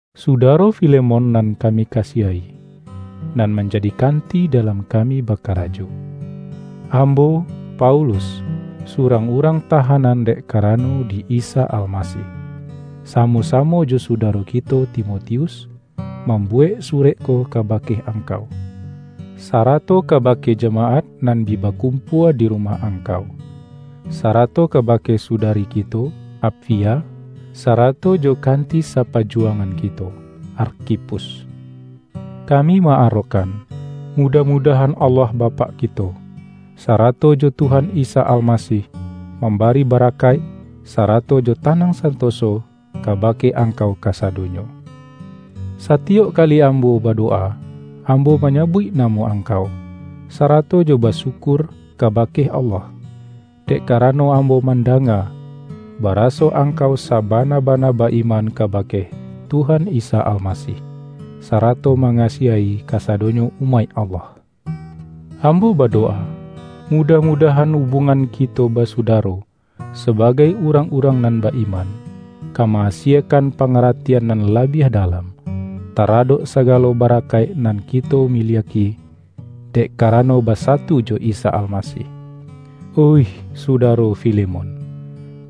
Sudaro Filemon nan kami kasiahi, nan manjadi kanti dalam kami bakarajo! Ambo, Paulus, surang urang tahanan dek karano di Isa Almasih, samo-samo jo sudaro kito Timotius, mambuwek surek ko kabake angkau, sarato kabake jamaat nan bi bakum-pua di rumah angkau; sarato kabake sudari kito, Apfia sarato jo kanti sa-pajuwangan kito, Arkhipus. Kami ma-arokkan, mudah-mudah-an Allah Bapak kito, sarato jo Tuhan Isa Almasih, mambari barakaik, sara-to jo tanang santoso kabake angkau kasadonyo. Satiyok kali ambo badowa, am-bo manyabuik namo angkau, sarato jo basyukur kabake Allah. Dek kara-no ambo mandanga, baraso angkau sa-bana-bana ba-iman kabake Tuhan Isa Almasih, sarato mangasiahi kasadonyo umaik Allah. Ambo badowa, mudah-mudahan ubuangan kito basudaro sa-bagai urang-urang nan ba-iman, ka ma-asiekan pangaratian nan labiah dalam, taradok sagalo barakaik nan kito mi-liak-i, dek karano basatu jo Isa Almasih. Oih sudaro Filemon,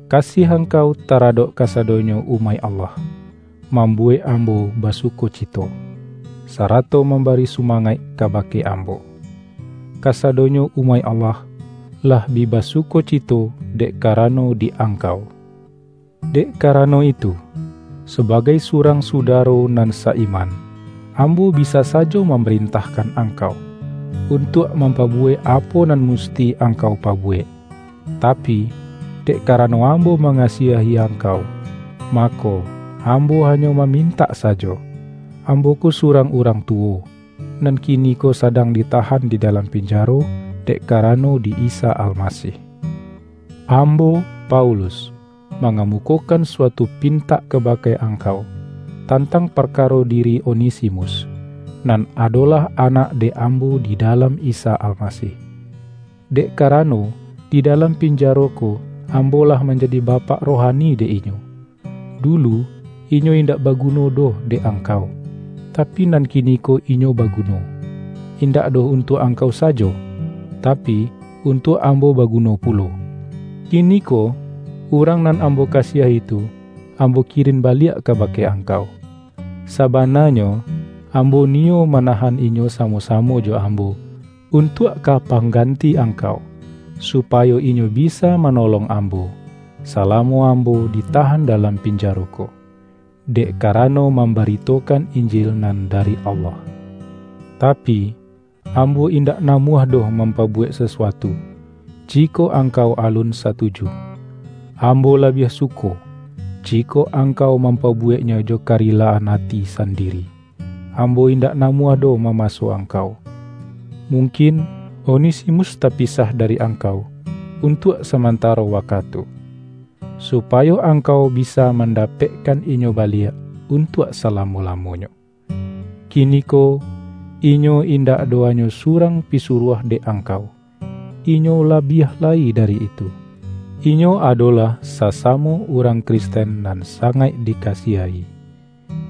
kasiah angkau ta-radok kasadonyo umaik Allah, mambu-wek ambo basukocito, sarato mamba-ri sumangaik kabake ambo! Kasadonyo umaik Allah, lah bi basukocito dek kara-no di angkau. Dek karano itu, sabagai surang sudaro nan sa-iman, ambo bisa sajo mamarentahkan angkau, untuak mampabuwek apo nan musti ang-kau pabuwek. Tapi, dek karano am-bo mangasiahi angkau, mako, ambo hanyo mamintak sajo. Ambo ko su-rang urang tuwo, nan kiniko sadang ditahan di dalam pinjaro dek kara-no di Isa Almasih. Ambo, Paulus, mangamukokan suatu pintak kabake angkau, tantang parkaro diri Onesi-mus, nan adolah anak dek ambo di dalam Isa Almasih. Dek karano, di dalam pinjaro ko ambo lah manjadi bapak rohani dek inyo. Dulu, inyo indak baguno doh dek angkau, tapi nan kiniko inyo baguno, indak doh untuak angkau sajo, tapi, untuak am-bo baguno pulo. Kiniko, urang nan ambo kasiahi tu, ambo kirin baliak kabake ang-kau. Sabananyo, ambo niyo mana-han inyo samo-samo jo ambo, untuak ka pangganti angkau, supayo inyo bi-sa manolong ambo, salamo ambo di-tahan dalam pinjaro ko, dek karano mambaritokan Injil nan dari Allah. Tapi, ambo indak namuah doh mampabuwek sasuatu, jikok angkau alun satuju. Ambo labiah suko, jikok angkau mampabuweknyo jo karilah-an ati sandiri; ambo indak namuah doh mamaso angkau. Mungkin, Onesimus tapisah da-ri angkau untuak samantaro wakatu, supayo angkau bisa mandapekkan inyo baliak untuak salamo-lamonyo. Kiniko, inyo indak doh hanyo su-rang pisuruah dek angkau; inyo la-biah lai dari itu. Inyo adolah sasamo urang Kristen nan sangaik dikasiahi.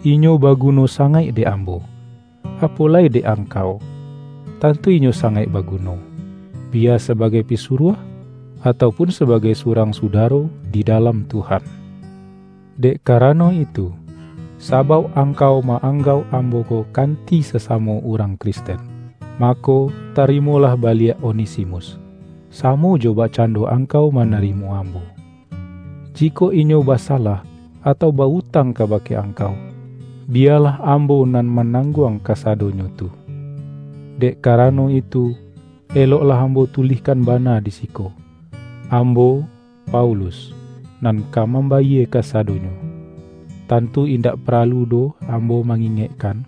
Inyo baguno sangaik dek ambo, apo lai dek angkau! Tantu inyo sangaik baguno, biya sabagai pisuruah, atau pun sabagai surang sudaro di dalam Tuhan! Dek karano itu, sabauk angkau ma-anggauk ambo ko kanti sasamo urang Kristen, mako, tarimolah baliak Onesimus, samo jo bakcando angkau manarimo ambo. Jikok inyo basa-lah, atau ba-utang kabake angkau, bi-yalah ambo nan manangguang kasa-donyo tu. Dek karano itu, eloklah ambo tulihkan bana di siko: Ambo, Paulus, nan ka mambayie kasado-nyo. (Tantu indak paralu doh ambo ma-ingekkan,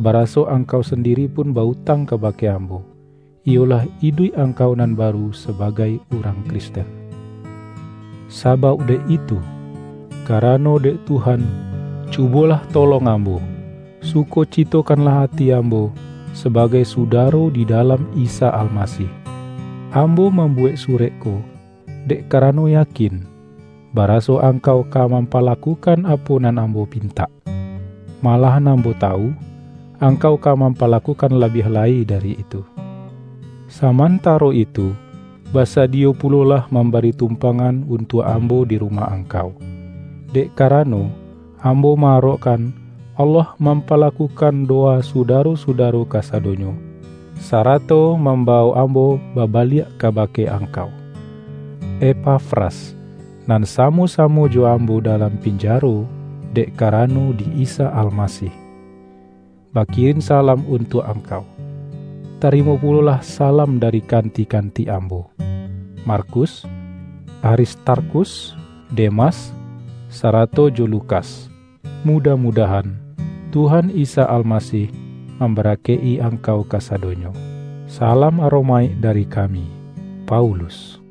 baraso angkau sandi-ri pun ba-utang kabake ambo, iyo-lah iduik angkau nan baru sabagai urang Kristen.) Sabauk dek itu, ka-rano dek Tuhan, cubolah tolong am-bo, sukocitokanlah ati ambo sabagai sudaro di dalam Isa Almasih. Ambo mambuwek surek ko, dek karano yakin, baraso angkau ka mampalakukan apo nan ambo pintak. Malahan ambo tawu, ang-kau ka mampalakukan labiah lai dari itu. Samantaro itu, basadiyo pulolah mambari tumpangan un-tuak ambo di rumah angkau, dek karano, ambo ma-arokkan Allah mampalakukan dowa sudaro-suda-ro kasadonyo, sarato mambawok ambo babaliak kabake angkau. Epafras, nan samo-samo jo am-bo dalam pinjaro dek karano di Isa Almasih, bakirin salam untuak ang-kau. Tarimo pulolah salam dari kanti-kanti ambo: Markus, Aristar-khus, Demas, sarato jo Lukas. Mudah-mudahan, Tuhan Isa Al-masih mambarakaik-i angkau kasa-donyo. Salam aromaik dari kami, Paulus